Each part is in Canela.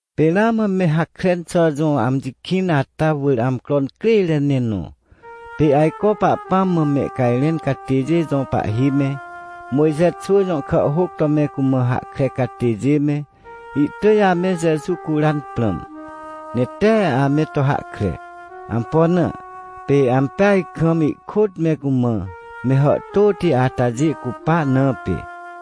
Pê ramã me Hakren xà jõ amji kĩn ata wỳr amcro incrêre ne nõ. Pê ajco Pahpãm mã mehcajrẽn catêjê jõ pahhi me, Mojxe xwỳ jõ kàhhôc to me cumã hahkre catêjê me, ihtỳj ame Jeju curan prãm, ne tee ame to hahkre. Ampo na? Pê ampeaj kam ihkôt me cumã me hàhtôti atajê cupa na pê.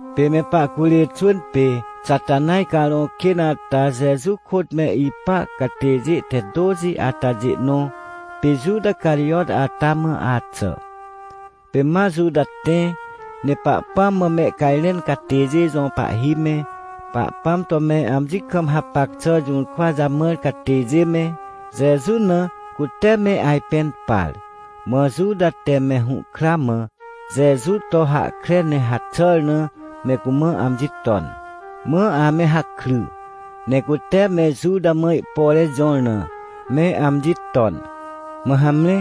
Pê me pahcurê xwỳn pê Xatanaj carõ kên ata Jeju kôt me ipa catêjê te tôxi atajê nõ, pê Juta Carijot ata mã axà. Pê ma Juta tẽ, ne Pahpãm mã mehcajrẽn catêjê jõ pahhi me, Pahpãm to me amji kam hapac xà jũrkwa jamãr catêjê me, Jeju na cute me ajpẽn par. Mã Juta te me hũhkra mã Jeju to hahkre ne haxàr na, me cumã amji ton. Mã ame hakry, ne cute me Juta mã ihpore jõr na me amji ton. Mã hamre,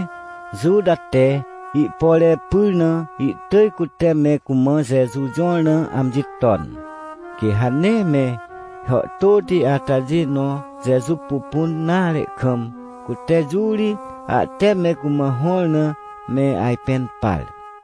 Juta te ihpore pyr na ihtỳj cute me cumã Jeju jõr na amji ton. Quê ha nee me hàhtôti atajê nõ Jeju pupun nare kam, cute jũ ri ahte me cumã hõr na, me ajpẽn par.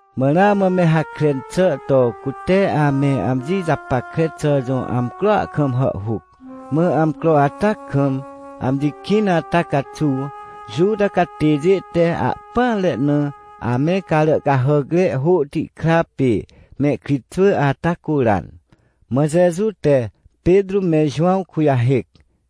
Mã ramã me Hakren xà to cute ame amji japackre xà jõ amcroa kam hàhhuc. Mã amcro ata kam, amji kĩn ata caxuw Juta catêjê te ahpỹanre na ame carà cahàcre hôhti kra pê mehkritxwỳ ata curan. Mã Jeju te Petrô me Jowãw kujahêc,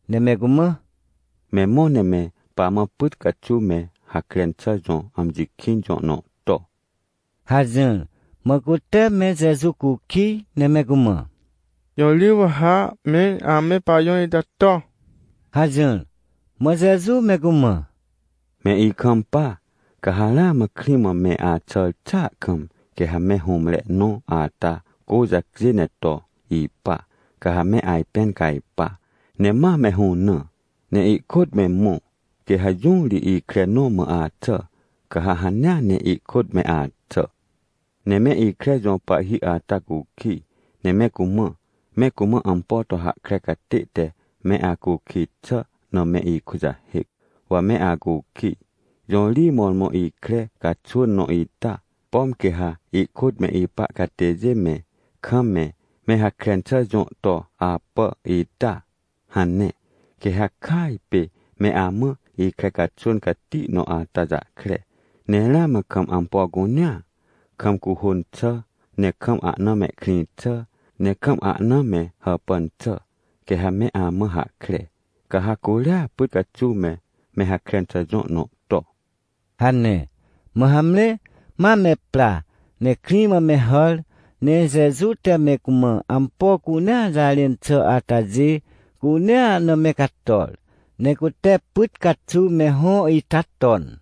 ne me cumã: ― Me mõ ne me pamã pyt caxuw me Hakren xà jõ amji kĩn jõ nõ to ― hajỹr. Mã cute me Jeju cukij ne me cumã: ― Jõ ri wa ha mẽr ame pajõ ita to? ― hajỹr. Mã Jeju me cumã: ― Me ikampa, ca ha ramã krĩ mã me axàr xàa kam, quê ha me hũmre nõ ata cô jacjê ne to ipa, ca ha me ajpẽn cajpa, ne ma me hũnã, ne ihkôt me mõ. Quê ha jũ ri ikre nõ mã axà, ca ha hanea ne ihkôt me axà. Ne me ikre jõ pahhi ata cukij, ne me cumã: “Me cumã ampo to hahkre catê te me acukij xà na me ikujahêc, wa me acukij, jũ ri mõrmõ ikre caxwỳn nõ ita, pom quê ha ihkôt me ipa catêjê me kam me me Hakren xà jõ to apà ita?” hane. Quê ha kỳaj pê me amã ikre caxwỳn cati nõ ata jahkre, ne ramã kam ampo cunea, kam cuhôn xà, ne kam ahna mehkrĩ xà, ne kam ahna me hàpàn xà, quê ha me amã hahkre. Ca ha curia pyt caxuw me me Hakren xà jõ nõ to ― hane. Mã hamre, ma me pra, ne krĩ mã me hàr, ne Jeju te me cumã ampo cunea jarẽn xà atajê cunea na me cator, ne cute pyt caxuw me hõ ita ton.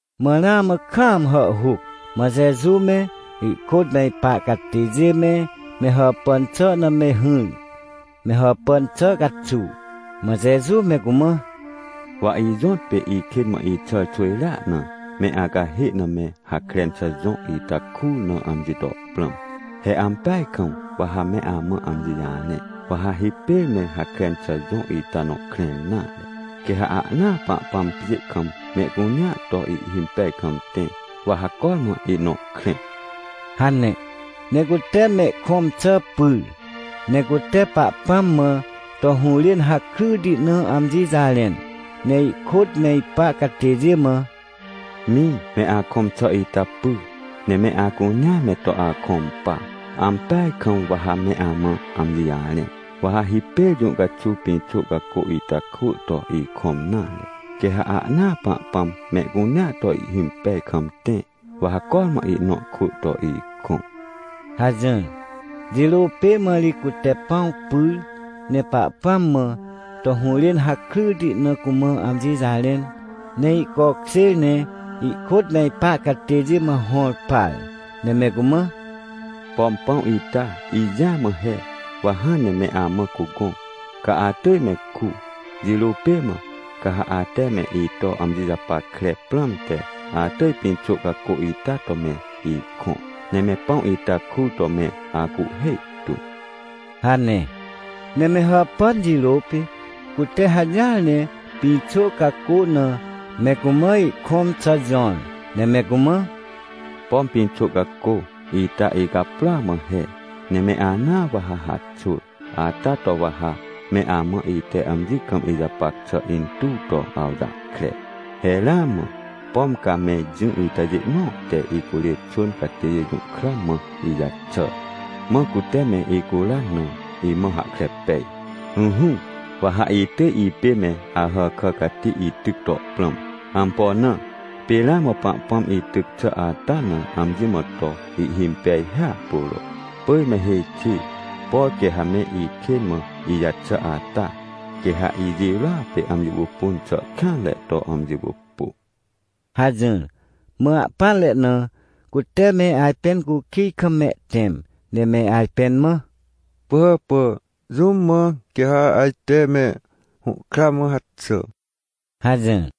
Mã ramã kaam hàhhuc, mã Jeju me, ihkôt me ipa catêjê me, me hàpàn xà na me hỹr, me hàpàn xà caxuw. Mã Jeju me cumã: ― Wa ijõtpê ikên mã ixàr xwỳjrea na, me acahê na me Hakren xà jõ ita kur na amji to prãm. He ampeaj kam wa ha me amã amji jarẽ, wa ha hipêr me Hakren xà jõ ita nõ krẽr nare, quê ha ahnaa Pahpãm pjê kam mehcunea to ihhimpej kam tẽ, wa ha cormã ihnõ krẽ ― hane. Ne cute mehkõm xà pyr, ne cute Pahpãm mã to hũrên hakryti na amji jarẽn, ne ihkôt me ipa catêjê mã: ― Mĩ, me akõm xà ita py, ne me acunea me to akõm pa. Ampeaj kam wa ha me amã amji jarẽ, wa ha hipêr jũ caxuw pĩxô cacô ita kwỳ to ikõm nare, quê ha ahnaa Pahpãm mehcunea to ihhimpej kam tẽ, wa ha cormã ihnõ kwỳ to ikõ ― hajỹr. Jirô pê mã ri cute pãw pyr, ne Pahpãm mã to hũrên hakryti na cumã amji jarẽn, ne ihcokjêr ne ihkôt me ipa catêjê mã hõr par, ne me cumã: ― Pom pãw ita, ijĩa mã he, wa hãn ne me amã cugõ, ca atỳj me ku. Jirô pê mã, ca ha ate me ito amji japackre prãmte, atỳj pĩxô cacô ita to me ikõ, ne me pãw ita kur to me acuhhê tu ― hane. Ne me hàpàn jirô pê, cute hajỹar ne pĩxô cacô na me cumã ihkõm xà jõr, ne me cumã: ― Pom pĩxô cacô ita, icaprôa mã he, ne me anaa wa ha haxwỳ. Ata to wa ha me amã ite amji kam ijapac xà intuw to awjahkre. ― He ramã, pom ca me jỹ itajê nõ te icurê xwỳn catêjê jũhkra mã ijaxàr, mã cute me icuran na, imã hahkre pej. Ỹhỹ, wa ha itỳj ipê me Ahàkà cati ityc to prãm. Ampo na? Pê ramã Pahpãm ityc xà ata na amji mã to ihhimpej hiahpuro. Pỳj me hêj xi, por quê ha me ikên mã ijaxà ata, quê ha ijirôa pê amji pupun xà kêanre to amji pupu ― hajỹr. Mã ahpỹanre na, cute me ajpẽn cukij kam mehtẽm, ne me ajpẽn mã: ― Pỳhàpà, jũm mã quê ha ajte me hũhkra mã haxà? ― hajỹr.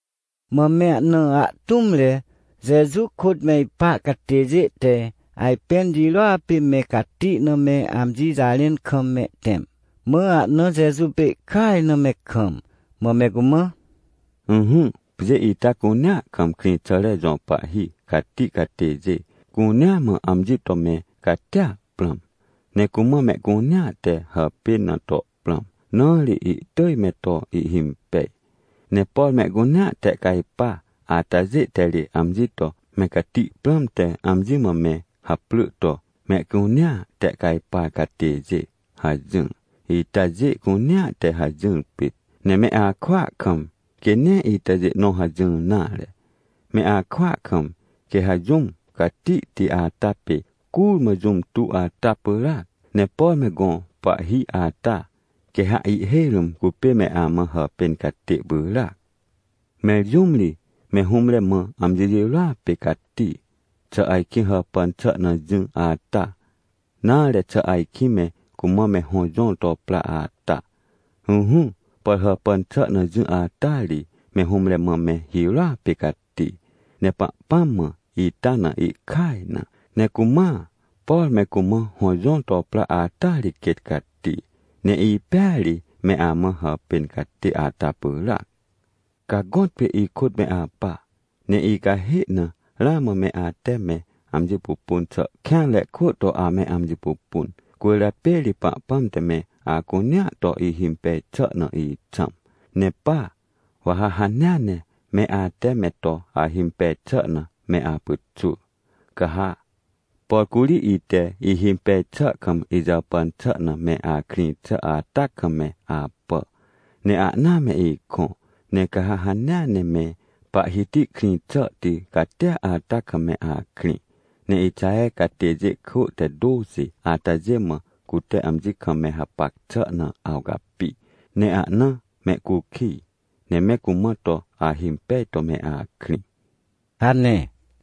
Mã me ahna ahtũmre, Jeju kôt me ipa catêjê te ajpẽn jirôa pê me cati na me amji jarẽn kam mehtẽm. Mã ahna Jeju pê ihkaj na me kam, mã me cumã: ― Ỹhỹ, pjê ita cunea kam krĩxàre jõ pahhi cati catêjê cunea mã amji to me catia prãm. Ne cumã mehcunea te hàpên na to prãm, na ri ihtỳj me to ihhimpej. Ne por mehcunea tehcajpa atajê te ri amji to me cati prãmte amji mã me haprỳ to: “Mehcunea Tehcajpar Catêjê” hajỹr. ― Itajê cunea te hajỹr pit, ne me akwỳa kam, quê nee itajê nõ hajỹr nare. Me akwỳa kam, quê ha jũm catihti ata pê curmã jũm tuw ata pyràac. Ne por me gõ pahhi ata, quê ha ihhêj rũm cupê me amã hàpên catê pyràac. Mẽr jũm ri, me hũmre mã amji jirô pê cati? Xà ajkĩ hàpàn xà na jỹ ata? Nare, xà ajkĩ me cumã me hõ jõr to pra ata? Ỹhỹ, por hàpàn xà na jỹ ata ri, me hũmre mã me hirôa pê cati. Ne Pahpãm mã ita na ihkaj na. Ne cumãa, por me cumã hõ jõr to pra ata ri quêt cati. Ne ipêa ri me amã hàpên catê ata pyràc. Ca gõtpê ikôt me apa, ne icahê na ramã me ate me amji pupun xà kêanre kwỳ to ame amji pupun. Cwỳrjapê ri Pahpãm te me acunea to ihhimpej xà na ixãm. Ne pa, wa ha hanea ne me ate me to ahimpej xà na me apyxwỳ. Ca ha, por curi ite ihimpej xà kam, ijàpàn xà na me akrĩ xà ata kam me apà, ne ahna me ikõ. Ne ca ha hanea ne me Pahhiti krĩ xàhti catia ata kam me akrĩ, ne Ixaher catêjê kwỳ te tôxi atajê mã cute amji kam me hapac xà na awcapi, ne ahna mehcukij, ne me cumã to ahimpej to me akrĩ ― hane.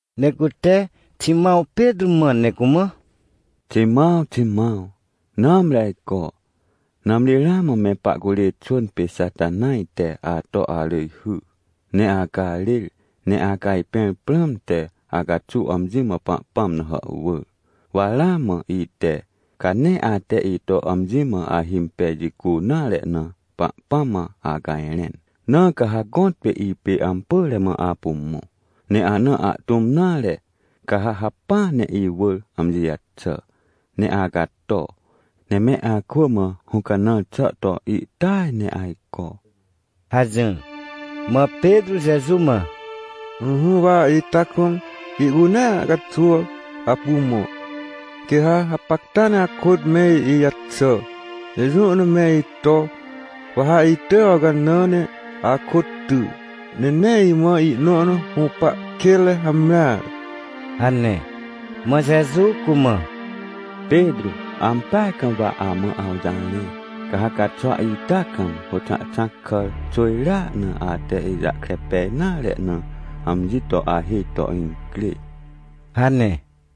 Ne cute Ximãw Petrô mãn ne cumã: ― Ximãw, Ximãw, nãmri ajco, nãmri ramã me pahcurê xwỳn pê Xatanaj te ato arỳjhy, ne acarêr ne acajpẽr prãmte acaxuw amji mã Pahpãm na hàhwỳr. Wa ramã ite, ca nee ate ito amji mã ahimpej jicu nare na, Pahpãm mã acajrẽn. Na ca ha gõtpê ipê ampỳre mã apu mõ, ne ana ahtũm nare, ca ha hacpỹa ne iwỳr amji jaxà, ne acato, ne me akwỳ mã hũcanãr xà to ihtỳaj ne ajco ― hajỹr. Mã Petrô Jeju mã: ― Ỹhỹ, wa ita kam ihcunea caxuw apu mõ. Quê ha hapacta ne akôt me ijaxà, ne jũ na me ito. Wa ha itỳj awcanã ne akôt ty. Ne nee imã ihnõ na hũpa kênre hamreare ― hane. Mã Jeju cumã: ― Petrô, ampeaj kam wa amã awjarẽ. Ca ha caxwa ita kam, hôxãhxãc kàr xwỳjrea na ate ijahkre pej nare na, amji to ahêj to incrê ― hane.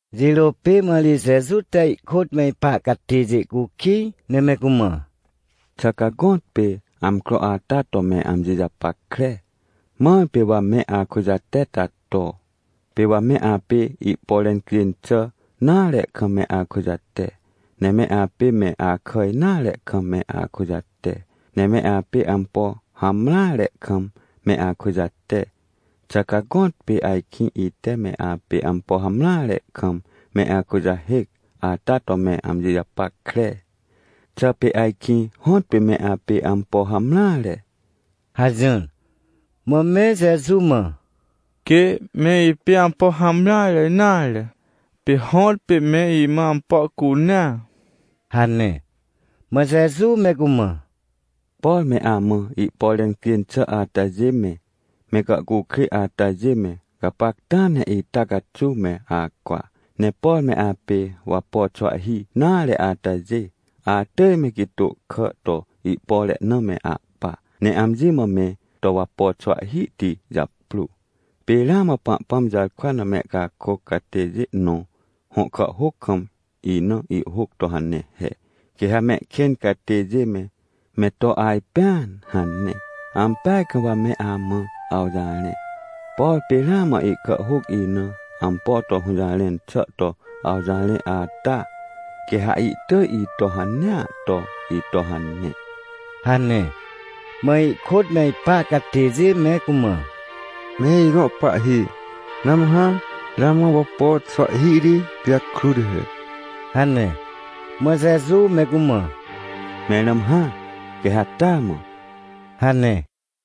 Jirô pê mã ri Jeju te ihkôt me ipa catêjê cukij, ne me cumã: ― Xà ca gõtpê amcro ata to me amji japackre, mãr pê wa me akujate ata to? Pê wa me apê ihpore cjên xà nare kam me akujate, ne me apê me akà nare kam me akujate, ne me apê ampo hamreare kam me akujate. Xà ca gõtpê ajkĩ ite me apê ampo hamreare kam me akujahêc ata to me amji japackre? Xà pê ajkĩ hõtpê me apê ampo hamreare? ― hajỹr. Mã me Jeju mã: ― Quê, me ipê ampo hamreare nare, pê hõtpê me imã ampo cunea ― hane. Mã Jeju me cumã: ― Por me amã ihpore cjên xà atajê me, me gàhcukrêj atajê me, gapacta ne ita caxuw me acwa. Ne por me apê wapo xwahhi nare atajê, atỳj me gitô kà to ihpore na me ahpa, ne amji mã me to wapo xwahhihti japrô. Pê ramã Pahpãm jarkwa na mehcakôc catêjê nõ hõ kàhhôc kam, ina ihhôc to hane he: “Quê ha mehkên catêjê me, me to ajpẽan” hane. Ampeaj kam wa me amã awjarẽ, por pê ramã ihkàhhôc ina ampo to hũjarẽn xà to awjarẽ ata, quê ha ihtỳj ito hanea to ito hane ― hane. Mã ihkôt me ipa catêjê me cumã: ― Me ijõ Pahhi, nãmhã, ramã wapo xwahhihti pijakrut he ― hane. Mã Jeju me cumã: ― Mẽr nãmhã, quê ha taa mã ― hane.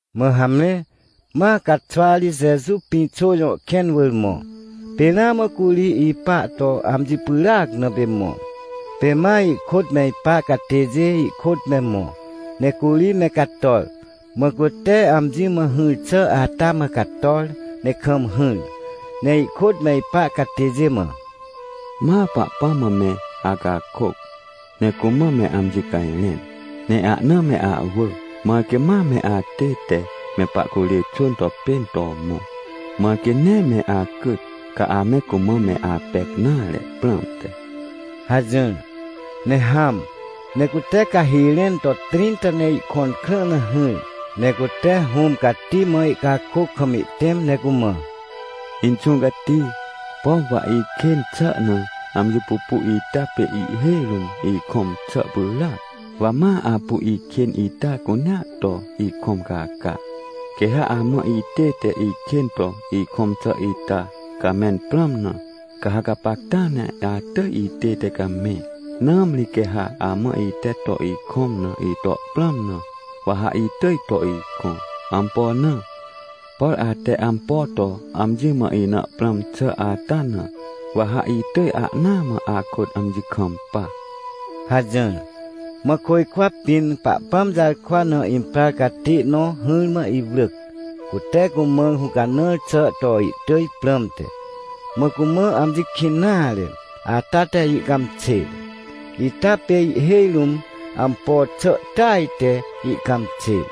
Mã hamre, ma caxwa ri Jeju Pĩxô jõ kẽn wỳr mõ. Pê ramã curi ipa to amji pyràac, na pê mõ. Pê ma ihkôt me ipa catêjê ihkôt me mõ. Ne curi me cator, mã cute amji mã hỹr xà ata mã cator ne kam hỹr, ne ihkôt me ipa catêjê mã: ― Ma Pahpãm mã me acakôc, ne cumã me amji cajrẽn, ne ahna me ahwỳ, mãr quê ma me atête me pahcurê xwỳn to pên to mõ, mãr quê nee me acyt, ca ame cumã me apec nare prãmte ― hajỹr. Ne hãm, ne cute cahi rẽn to trĩnta ne ihkõn krã na hỹr, ne cute Hũm Cati mã ihcakôc kam ihtẽm, ne cumã: ― Inxũ Cati, pom wa ikên xà na amji pupu ita pê ihhêj rũm ikõm xà pyràac. Wa ma apu ikên ita cunea to ikõm caca. Quê ha amã itête ikên to ikõm xà ita camẽn prãm na, ca ha gapacta ne atỳj itête camẽ, nãmri quê ha amã ite to ikõm na ito prãm na, wa ha itỳj to ikõ. Ampo na? Por ate ampo to amji mã ina prãm xà ata na, wa ha itỳj ahnaa mã akôt amji kampa ― hajỹr. Mã côjkwa pĩn Pahpãm jarkwa na imprar catê nõ hỹrmã iwrỳc, cute cumã hũcanãr xà to ihtỳj prãmte. Mã cumã amji kĩn nare ata te ihcãmxêr, ita pê ihhêj rũm ampo xà ihtỳaj te ihcãmxêr.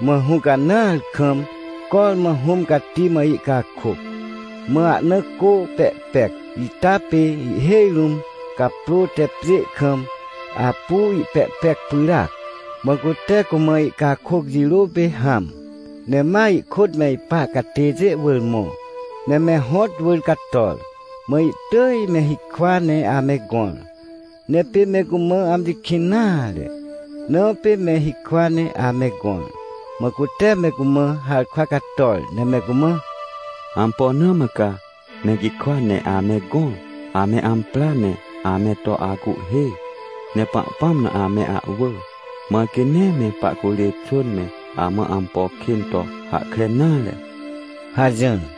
Mã hũcanãar kam cormã Hũm Cati mã ihcakôc. Mã ahna cô pehpec ita pê ihhêj rũm caprô te pjê kam apu ihpehpec pyràac. Mã cute cumã ihcakôc jirô pê hãm, ne ma ihkôt me ipa catêjê wỳr mõ. Ne me hõt wỳr cator, mã ihtỳj me hikwa ne ame gõr, ne pê me cumã amji kĩn nare, na pê me hikwa ne ame gõr. Mã cute me cumã harkwa cator, ne me cumã: ― Ampo na mã ca me gikwa ne ame gõr? Ame ampra ne ame to acuhhê, ne Pahpãm na ame ahwỳ, mãr quê nee me pahcurê xwỳn me amã ampo kên to hahkre nare ― hajỹr.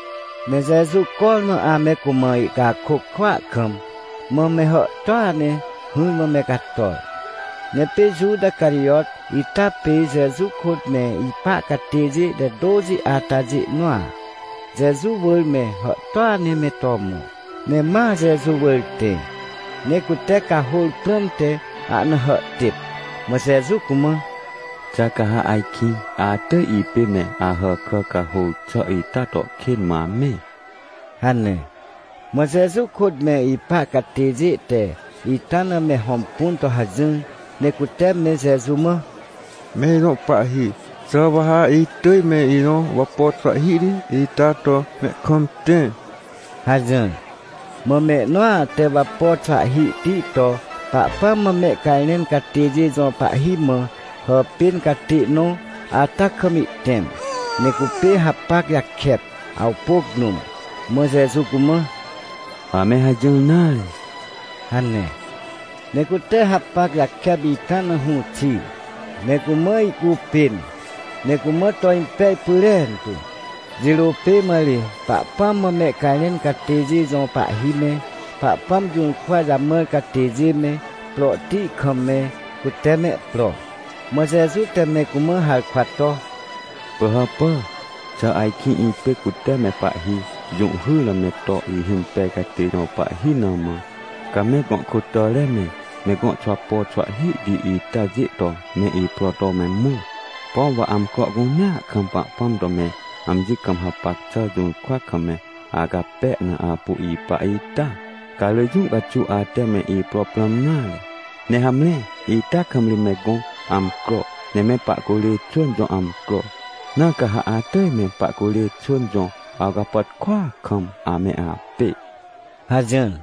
Ne Jeju cormã ame cumã ihcakôc kwỳa kam, mã me hàhtôa ne hỹrmã me cator. Ne pê Juta Carijot ita pê Jeju kôt me ipa catêjê te tôxi atajê nõa, Jeju wỳr me hàhtôa ne me to mõ, ne ma Jeju wỳr tẽ, ne cute cahôr prãmte ahna hàhtêp. Mã Jeju cumã: ― Xà ca ha ajkĩ atỳj ipê me Ahàkà cahôr xà ita to kên mã amẽ? ― hane. Mã Jeju kôt me ipa catêjê te ita na me hõmpun to hajỹr, ne cute me Jeju mã: ― Me ijõ Pahhi, xà wa ha itỳj me ijõ wapo xwahhihti ita to me kam tẽ? ― hajỹr. Mã mehnõa te wapo xwahhihti to Pahpãm mã mehcajrẽn catêjê jõ pahhi mã hàpên catê nõ ata kam ihtẽm, ne cupê hapac jakep, awpôc rũm. Mã Jeju cumã: ― Ame hajỹr nare! ― hane. Ne cute hapac jakep ita na hũ xir, ne cumã ihcupên, ne cumã to impej pyrentu. Jirô pê mã ri Pahpãm mã mehcajrẽn catêjê jõ pahhi me, Pahpãm jũrkwa jamãr catêjê me, prohti kam me, cute mehpro. Mã Jeju te me cumã harkwa to: ― Pỳhàpà, xà ajkĩ ipê cute me pahhi jũhhyr na me to ihhimpej catê jõ pahhi na mã, ca me gõ kôtàre me, me gõ xwapo xwahhihti itajê to me ipro to me mõ? Pom wa amcro cunea kam Pahpãm to me amji kam hapac xà jũrkwa kam me acape na apu ipa ita? Ca rỳ jũ caxuw ate me ipro prãm nare. Ne hamre ita kam ri me gõ amcro, ne me pahcurê xwỳn jõ amcro, na ca ha atỳj me pahcurê xwỳn jõ awcapàtkôa kam ame apê ― hajỹr.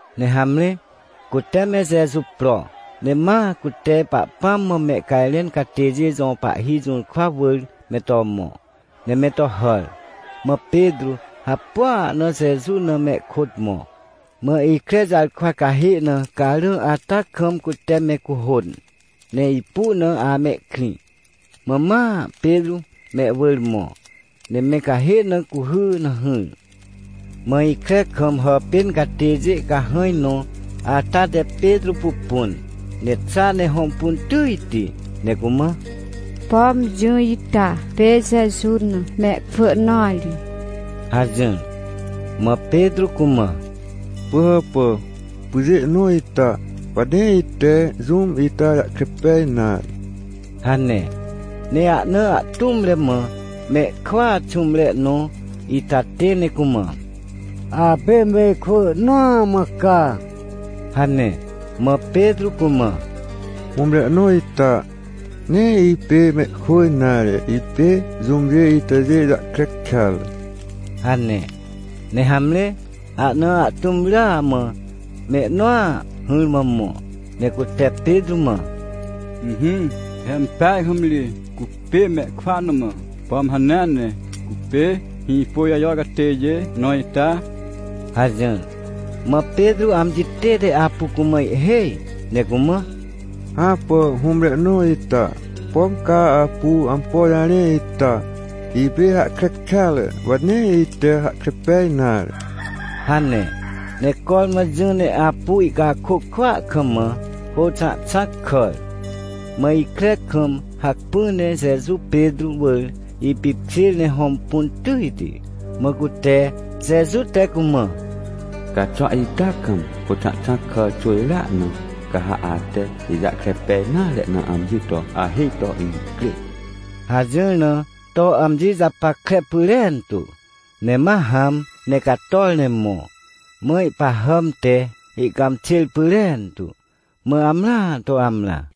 Ne hamre, cute me Jeju pro, ne ma cute Pahpãm mã mehcajrẽn catêjê jõ pahhi jũrkwa wỳr me to mõ, ne me to hàr. Mã Petrô hapua na Jeju na mehkôt mõ. Mã ikre jarkwa cahê na, carã ata kam cute me cuhôn, ne ipu na amehkrĩ, mã ma Petrô mehwỳr mõ, ne me cahê na cuhy na hỹr. Mã ikre kam hàpên catêjê cahãj nõ ata te Petrô pupun, ne xa ne hõmpun tỳjti, ne cumã: ― Pom jỹ ita pê Jeju na mehkwỳ nõa ri ― hajỹr. Mã Petrô cumã: ― Pỳhàpà, pyjê nõ ita, wa nee ite jũm ita jahkre pej nare ― hane. Ne ahna ahtũmre mã mehkwỳa xũmre nõ ita tẽ ne cumã: ― Apê mehkwỳ nõa mã ca ― hane. Mã Petrô cumã: ― Hũmre nõ ita, nee ipê mehkwỳ nare, ipê jũmjê itajê jahkre kêatre ― hane. Ne hamre, ahna ahtũm rya mã mehnõa hỹrmã mõ, ne cute Petrô mã: ― Ỹhỹ, he ampeaj kam ri cupê mehkwỳa nõ mã, pom hanea ne cupê Hĩpôjajo catêjê nõ ita? ― hajỹr. Mã Petrô amji tête apu cumã ihhêj, ne cumã: ― Hãpà, hũmre nõ ita, pom ca apu ampo jarẽ ita, ipê hahkre kêatre, wa nee ite hahkre pej nare ― hane. Ne cormã jỹ ne apu ihcakôc kwỳa kam mã hôxãhxãc kàr. Mã ikre kam, hacpỹ ne Jeju Petrô wỳr ipipkjêr ne hõmpun tỳjti. Mã cute Jeju te cumã: “Caxwa ita kam, hôxãhxãc kàr xwỳjrea na, ca ha ate ijahkre pej nare na amji to ahêj to incrê” hajỹr na, to amji japackre pyrentu. Ne ma hãm ne cator ne mõ. Mã ihpahàm te ihcãmxêr pyrentu, mã amrãa to amrã.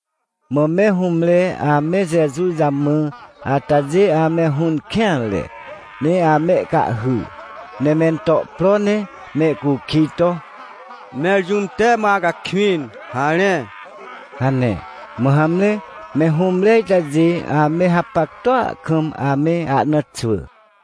Mã me hũmre ame Jeju jamã atajê ame hũn kêanre, ne amehcahhy. Ne mento pro ne mehcukij to: ― Mẽr jũm te mã acakwĩn? Harẽ! ― hane. Mã hamre, me hũmre itajê ame hapactua kam ame ahna xwỳ.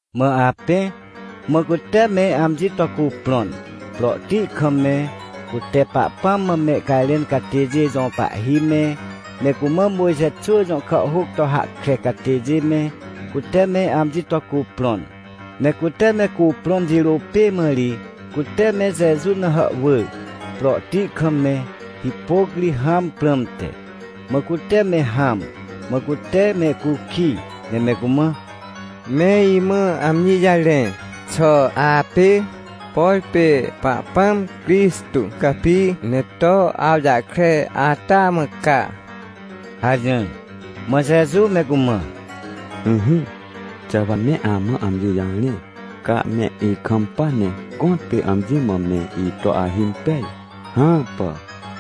Mã apẽ, mã cute me amji to cuprõn. Prohti kam me, cute Pahpãm mã mehcajrẽn catêjê jõ pahhi me, me cumã Mojxe xwỳ jõ kàhhôc to hahkre catêjê me, cute me amji to cuprõn. Ne cute me cuprõn jirô pê mã ri cute me Jeju na hàhwỳr, prohti kam me hipôc ri hãm prãmte. Mã cute me hãm. Mã cute mehcukij, ne me cumã: ― Me imã amji jarẽ, xà apê, por pê Pahpãm Crixtô capi ne to awjahkre ata mã ca? ― hajỹr. Mã Jeju me cumã: ― Ỹhỹ, xà wa me amã amji jarẽ, ca me ikampa ne gõtpê amji mã me ito ahimpej? Hãpà.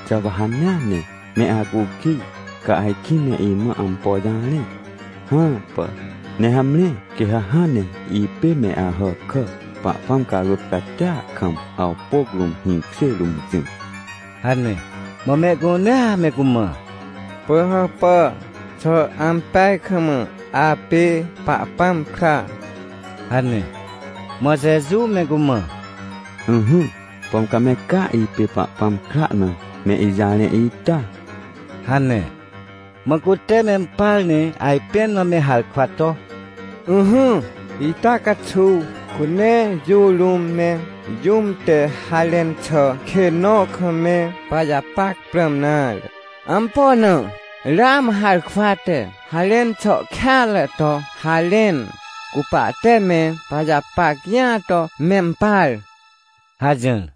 Xà wa hanea ne me acukij, ca ajkĩ me imã ampo jarẽ? Hãpà. Ne hamre, quê ha hãn ne ipê me Ahàkà, Pahpãm carôt catia kam, awpôc rũm, hĩkjê rũm jỹ ― hane. Mã mehcunea me cumã: ― Pỳhàpà, xà ampeaj kam apê Pahpãm kra? ― hane. Mã Jeju me cumã: ― Ỹhỹ, pom ca me caa ipê Pahpãm kra na me ijarẽ ita? ― hane. Mã cute mempar ne ajpẽn mã me harkwa to: ― Ỹhỹ, ita caxuw cu nee jũ rũm me jũm te harẽn xà kên nõ kam me pajapac prãm nare. Ampo na? Ramã harkwa te harẽn xà kêanre to harẽn, cu pahte me pajapac jĩa to mempar ― hajỹr.